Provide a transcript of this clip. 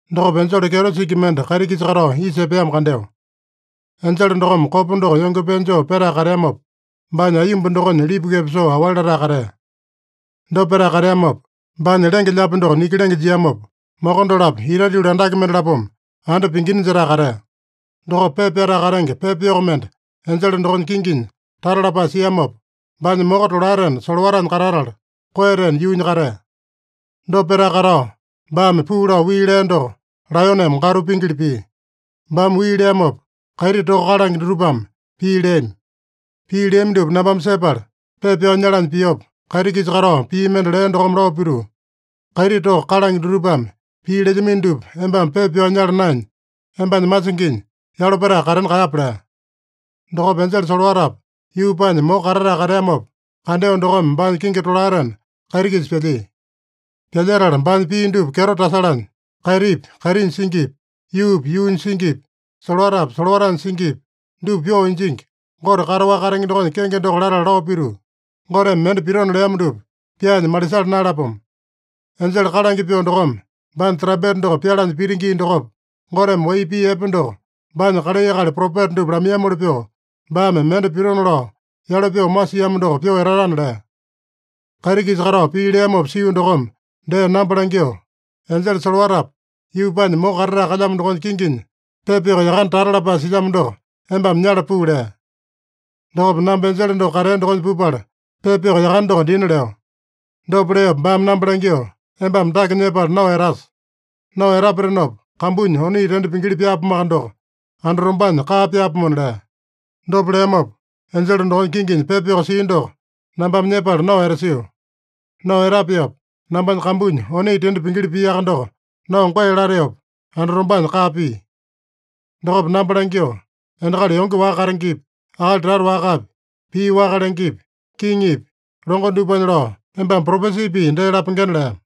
Dokopa enjele kyeto singi mende kaiti-kisa katao isa epeamo kandeo. Enjele dokome kopa doko yonge pee joo petae kateamopa, baanya aiyomba dokonya lipukepa soo aowali latae katea. Dopa petae kateamopa, baanya lenge-lyaapi doko niki lenge jiamopa, moko dolapo itate yuli andake mendalapome anda pingina jetae katea. Dokopa pepa pyatae katenge pepa yoko mende enjele dokonya kinginya tata lapae siamopa, baanya moko tolaetena solowatanya katatala, koeyatena yuunya katea. Dopa petae katao, baame puu lao wii lea doko laeyoneme gatu pingili pia. Baame wii leamopa, kaiti toka kalange dutupame pii leami. Pii leami dupa nambame sepala pepa pyao nyalanya piopa, kaiti-kisa katao pii mende lea dokome lao pituu, “Kaiti toka kalange dutupame pii lelyamino dupa embame pepa pyao nyala naenya, embanya masinginya yalo petae katena kaeyape” lea. Dokopa enjele solowatapa, yuupanya moko katatae kateamopa kandeo dokome baanya kingi tolaetena kaiti-kisa pyalyia. Pyalyetala baanya pii dupa kyeto tasalanya, kaitipi, kaitinya singipi, yuupi, yuunya singipi, solowatapi, solowatanya singipi, dupa pyoo injingi Gote kataowaka katenge dokonya kenge doko latala lao pituu, “Goteme mende pitona leamo dupa pyaanya malisala naeyalapomo. Enjele kalange pyoo dokome baanya trampeta doko pyalanya pita gii dokopa, Goteme wai pii epe doko baanya kalai akali propeta dupa lamaiyamoli pyoo, baame mende pitona lao yalo pyoo masiamo doko pyoo etatana” lea. Kaiti-kisa katao pii leamopa sio dokome dee namba langyoo, “Enjele solowatapa, yuupanya moko katatae kalyamo dokonya kinginya pepa yoko yakane tata lapae silyamo doko embame nyala puu” lea. Dokopa namba enjele doko katea dokonya pupala, pepa yoko yakane doko dina leo. Dopa leopa baame namba langyoo, “Embame dake nyepala nao etasa. Nao etapatenopa, kambunya oni tende pingili pyaapomoaka doko, andatombanya kaa pyaapomona” lea. Dopa leamopa, enjele dokonya kinginya pepa yoko sia doko nambame nyepala nao etasio. Nao etapeopa, nambanya kambunya oni tende pingili piaka doko, nao goe lateopa andatombanya kaa pia. Dokopa namba langyoo, “Endakali yonge waka katengepi, akali tata wakapi, pii waka lengepi, kiŋipi, longo dupanya lao, embame propesi pii dee lapengena” lea.